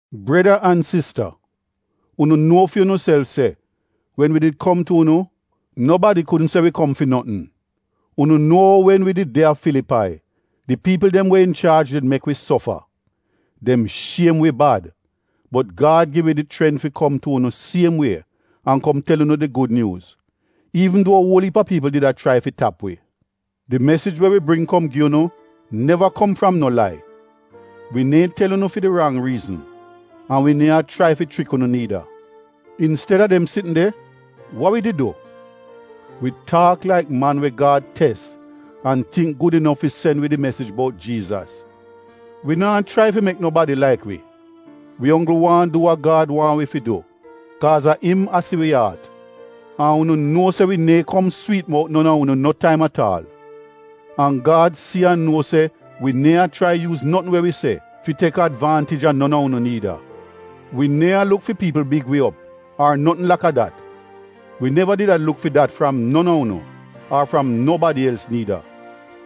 Breda an sista, unu nuo fi unuself se wen wi did kom tu unu, nobadi kudn se wi kom fi notn. Unu nuo ou wen wi did de a Filipai di piipl dem we inchaaj did mek wi sofa. Dem shiem wi bad bot Gad gi wi di chrent fi kom tu unu siem wie an kom tel unu di Gud Nyuuz, iivn duo uol iip a piipl did a chrai fi tap wi, di mesij we wi bring kom gi unu neva kom fram no lai. Wi neehn tel unu fi di rang riizn, an wi neehn a chrai fi chrik unu niida. Insteda dem sitn de, wa wi did du? Wi taak laik man we Gad tes an tingk gud inof fi sen wid di mesij bout Jiizas. Wi naa chrai fi mek nobadi laik wi, wi onggl waahn du wa Gad waahn wi fi du kaaz a im a si wi aat. An unu nuo se wi neehn kom swiit-mout non a unu no taim at aal, an Gad si an nuo se wi neehn a chrai yuuz notn we wi se fi tek advaantij a non a unu niida. Wi neehn a luk fi piipl big wi op ar notn laka dat. Wi neva did a luk fi dat fram non a unu ar fram nobadi els niida.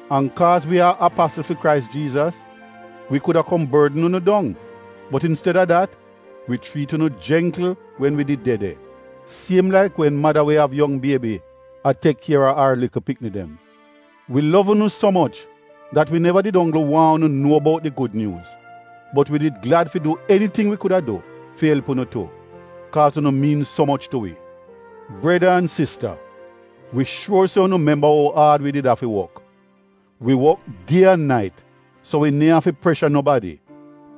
An kaaz wi a apasl fi Krais Jiizas, wi kuda kom bordn unu dong. Bot insteda dat, wi chriit unu jengkl wen wi did de de, siem laik wen mada we av yong biebi a tek kiera ar likl pikni dem. Wi lov unu so moch dat wi neva did onggl waahn unu nuo bout di Gud Nyuuz, bot wi did glad fi du eniting wi kuda du fi elp unu tu — kaaz unu miin so moch tu wi. Breda an sista, wi shuor se unu memba ou aad wi did afi wok. Wi wok die an nait so wi neehn afi presha nobadi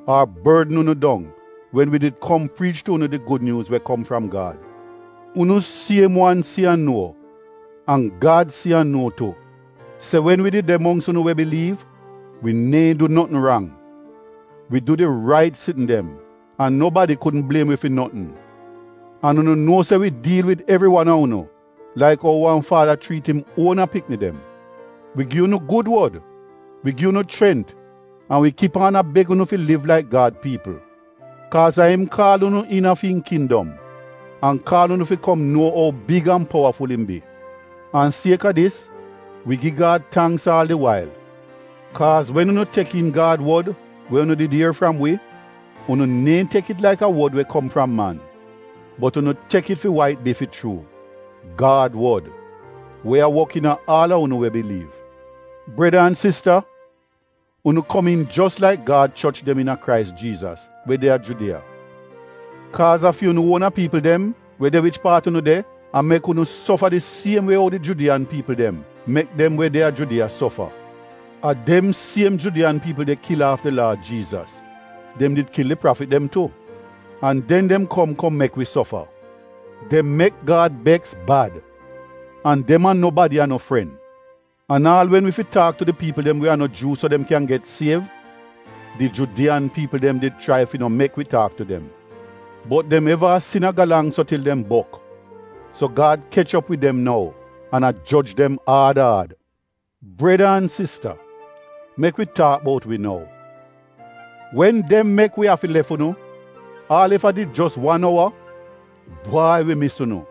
ar bordn unu dong wen wi did kom priich tu unu di Gud Nyuuz we kom fram Gad. Unu siem wan si an nuo, an Gad si an nou tu se wen wi did de mongks unu we biliiv, wi neehn du notn rang. Wi du di rait sitn dem an nobadi kudn bliem wi fi notn. An unu nuo se wi diil wid evri wan a unu laik ou wan faada chriit im uona pikni dem. Wi gi unu gud wod, wi gi unu chrent an wi kip aan a beg unu fi liv laik Gad piipl. Kaaz a im kaal unu iina fi im kindom an kaal unu fi kom nuo ou big an powaful im bi. An sieka dis wi gi Gad tangks aal di wail. Kaaz wen unu tek iin Gad wod we unu did ier fram wi, unu neehn tek it laik a wod we kom fram man, bot unu tek it fi wa it bi fi chuu — Gad wod, we a wok iina aal a unu we biliiv. Breda an sista, unu komiin jos laik Gad choch dem iina Krais Jiizas, we de a Judiya. Kaaz a fi unu uona piipl dem, we de wich paat unu de, a mek unu sofa di siem wie ou di Judiyan piipl dem mek dem we de a Judiya sofa. A dem siem Judiyan piipl de kil aaf di Laad Jiizas; dem did kil di prafit dem tu. An den dem kom kom mek wi sofa. Dem mek Gad beks bad! An dem an nobadi a no fren! An aal wen wi fi taak tu di piipl dem we a no Juu so dem kyan get siev, di Judiyan piipl dem did chrai fi no mek wi taak tu dem. Bot dem eva a sin a galang so til dem bok, so Gad kech op wid dem nou an a joj dem aad aad. Breda an sista, mek wi taak bout wi nou. Wen dem mek wi afi lef unu, aal ef a did jos wan ouwa, bwai wi mis unu!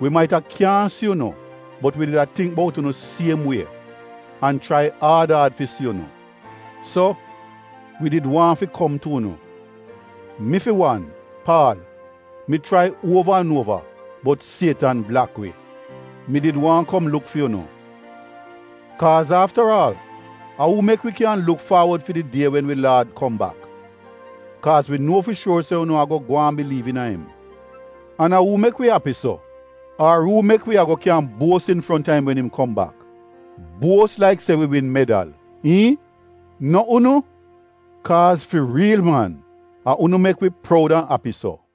Wi maita kyaahn si unu bot wi did a tingk bout unu siem wie, an chrai aad aad fi si unu. So, wi did waahn fi kom tu unu. Mi fi wan — Paal, mi chrai uova an uova bot Sietan blak wi. Mi did waahn kom luk fi unu. Kaaz aftaraal, a uu mek wi kyan luk faawod fi di die wen wi Laad kom bak, kaaz wi nuo fi shuor se unu ago gwaan biliiv iina im. An a uu mek wi api so? Ar uu mek wi ago kyan buos infronta im wen im kom bak, buos laik se wi win medal? iihn? No unu! Kaaz fi riil man, a unu mek wi proud an api so!